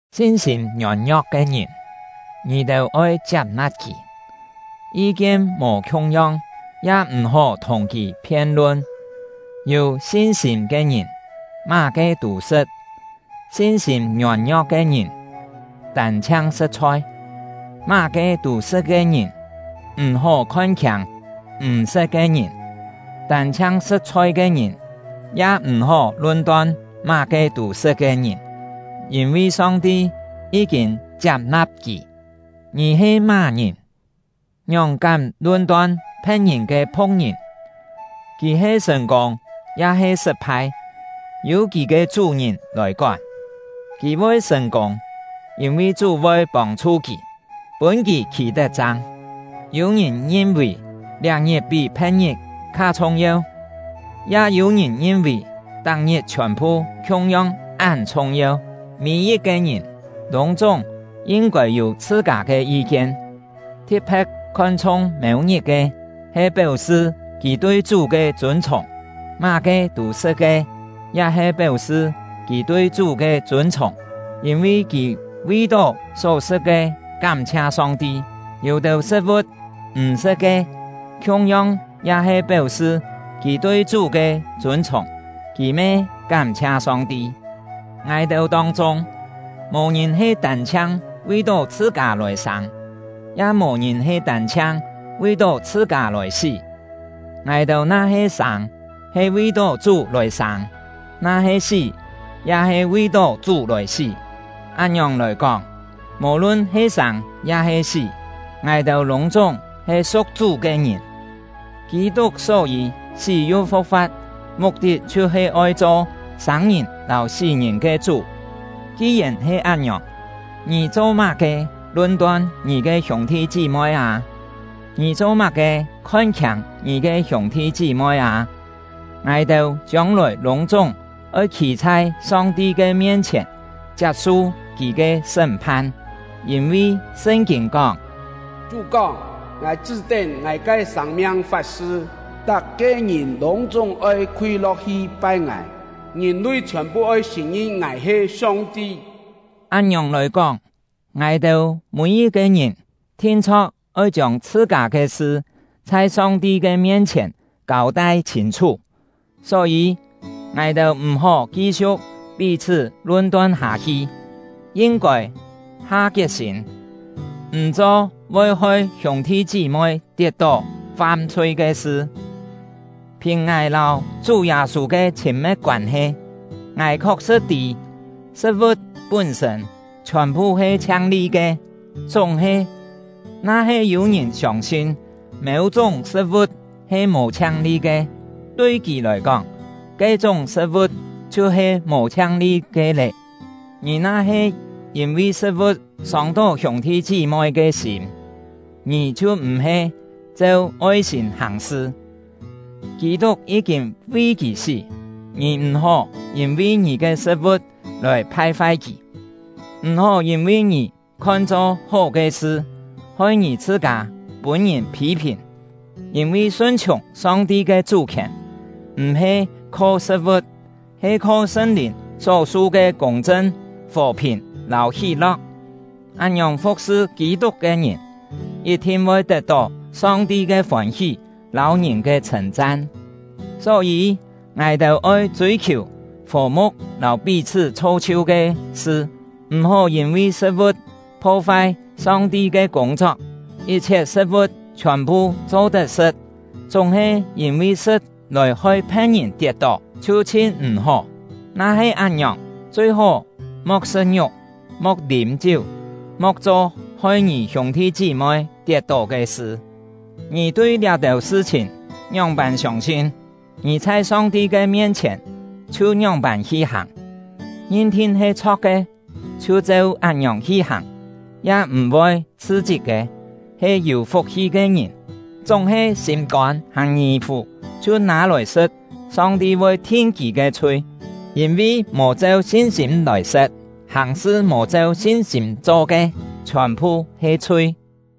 Sin-sîm ngiôn-ngio̍k ke ngìn, ngì-têu oi chiap-na̍p kì; yi-kien mò khiung-yong, ya m̀-hó thùng kì phien-lun. Yû sin-sîm ke ngìn, má-ke tû sṳ̍t; sin-sîm ngiôn-ngio̍k ke ngìn tân-chhiang sṳ̍t chhoi. Má-ke tû sṳ̍t ke ngìn m̀-hó khon-khiâng m̀ sṳ̍t ke ngìn; tân-chhiang sṳ̍t-chhoi ke ngìn ya m̀-hó lun-ton má-ke tû sṳ̍t ke ngìn; yîn-vi Song-ti yí-kîn chiap-na̍p kì. Ngì he má-ngìn, ngióng kám lun-ton phe̍t-ngìn ke phu̍k-ngìn? Kì he sṳ̀n-kûng ya-he sṳt-phai, yû kì ke chú-ngìn lòi kón. Kì voi sṳ̀n-kûng, yîn-vi Chú voi pông-chhu kì, pûn kì khî-tet-chang. Yû-ngìn ngin-vì liá-ngit pí phe̍t-ngit kha chhung-yeu; ya yû-ngìn ngin-vì tak-ngit chhiòn-phu khiung-yong án chhung-yeu. Mî-yit-ke ngìn lûng-chúng yin-kôi yû chhṳ-kâ ke yi-kien. Thi̍t-phe̍t khon-chhung mêu-ngit ke, he péu-sṳ kì tui Chú ke chûn-chhùng. Má-ke tû sṳ̍t ke, ya he péu-sṳ kì tui Chú ke chûn-chhùng, yîn-vi kì vi-tó só sṳ̍t ke kám-chhia Song-ti; yû-têu sṳ̍t-vu̍t m̀ sṳ̍t ke, khiung-yong ya he péu-sṳ kì tui Chú ke chûn-chhùng, kì me kám-chhia Song-ti. Ngài-têu tông-chûng, mò-ngìn he tân-chhiang vi-tó chhṳ-kâ lòi sâng, ya mò-ngìn he tân-chhiang vi-tó chhṳ-kâ lòi sí; ngài-têu na-he sâng, he vi-tó Chú lòi sâng; na-he sí, ya he vi-tó Chú lòi sí. Án-ngiòng lòi kóng, mò-lun he sâng ya-he sí, ngài-têu lûng-chúng he su̍k Chú ke ngìn. Kî-tuk só-yî sí yu fu̍k-fa̍t, muk-tit chhiu-he oi cho sâng-ngìn lâu sí-ngìn ke Chú. Ki-yèn he án-ngiòng, ngì cho-má-ke lun-ton ngì ke hiûng-thi chí-moi â? Ngì cho-má-ke khon-khiâng ngì ke hiûng-thi chí-moi â? Ngài-têu chiông-lòi lûng-chúng oi khî chhai Song-ti ke mien-chhièn, chiap-su Kì ke sṳ́m-phan; yîn-vi Sṳn-kîn kóng: Chú kóng: Ngài chṳ́-tén Ngài ke sâng-miang fat-sṳ, tak-ke ngìn lûng-chúng oi khúi lo̍k-hi pai Ngài; ngìn-lui chhiòn-phu oi sṳ̀n-ngin Ngài he Song-ti. Án-ngiòng lòi kóng, ngài-têu mî-yit-ke ngìn thin-chho̍k oi chiông chhṳ-kâ ke sṳ chhai Song-ti ke mien-chhièn kâu-tai chhîn-chhú. Só-yî, ngài-têu m̀-hó ki-siu̍k pí-chhṳ́ lun-ton hâ-hi; yin-kôi ha kiet-sîm, m̀ cho voi hoi hiûng-thi chí-moi tiet-tó fam-chhui ke sṳ. Phìn ngài lâu Chú Yâ-sû ke chhîn-me̍t koân-he, ngài khok-sṳ̍t tî, sṳ̍t-vu̍t pún-sṳ̂n chhiòn-phu he chhiang-li ke; chúng-he, na-he yû-ngìn siông-sin mêu-chúng sṳ̍t-vu̍t he mò chhiang-li ke, tui kì lòi kóng, ke-chúng sṳ̍t-vu̍t chhiu-he mò chhiang-li ke lé. Ngì na-he yîn-vi sṳ̍t-vu̍t sông-tó hiûng-thi chí-moi ke sîm, ngì chhiu m̀-he cheu oi-sîm hàng-sṳ. Kî-tuk yí-kîn vi kì sí, ngì m̀-hó yîn-vi ngì ke sṳ̍t-vu̍t lòi phai-fai kì! M̀-hó yîn-vi ngì khon-cho hó ke sṳ, hoi ngì chhṳ-kâ pûn-ngìn phî-phìn. Yîn-vi sun-chhiùng Song-ti ke chú-khièn m̀-he kho sṳ̍t-vu̍t, he kho Sṳn-Lìn só-su ke kûng-chṳn, fò-phìn, lâu hí-lo̍k. Án-ngiòng fu̍k-sṳ Kî-tuk ke ngìn, yit-thin voi tet-tó Song-ti ke fôn-hí lâu ngìn ke chhṳ̂n-chan. Só-yî, ngài-têu oi chûi-khiù fò-mu̍k lâu pí-chhṳ́ chho-chhiu ke sṳ. M̀-hó yîn-vi sṳ̍t-vu̍t pho-fai Song-ti ke kûng-chok. Yit-chhiet sṳ̍t-vu̍t chhiòn-phu cho-tet sṳ̍t, chúng-he yîn-vi sṳ̍t lòi hoi phe̍t-ngìn tiet-tó, chhiu chhin m̀-hó. Na-he án-ngiòng, chui-hó mo̍k sṳ̍t-ngiuk, mo̍k lîm-chiú; mo̍k cho hoi ngì hiûng-thi chí-moi tiet-tó ke sṳ. Ngì tui liá-têu sṳ-chhìn ngióng-pân siông-sin, ngì chhai Song-ti ke mien-chhièn chhiu ngióng-pân hi hàng! Ngin-thin he chho̍k ke, chhiu cheu án-ngiòng hi hàng, ya m̀-voi chhṳ-chit ke, he yû fuk-hi ke ngìn! Chúng-he, sîm-kôn hàn ngì-fù chhiu nâ-lòi sṳ̍t, Song-ti voi thin kì ke chhui, yîn-vi mò cheu sin-sîm lòi sṳ̍t. Hàng-sṳ mò cheu sin-sîm cho ke, chhiòn-phu he chhui.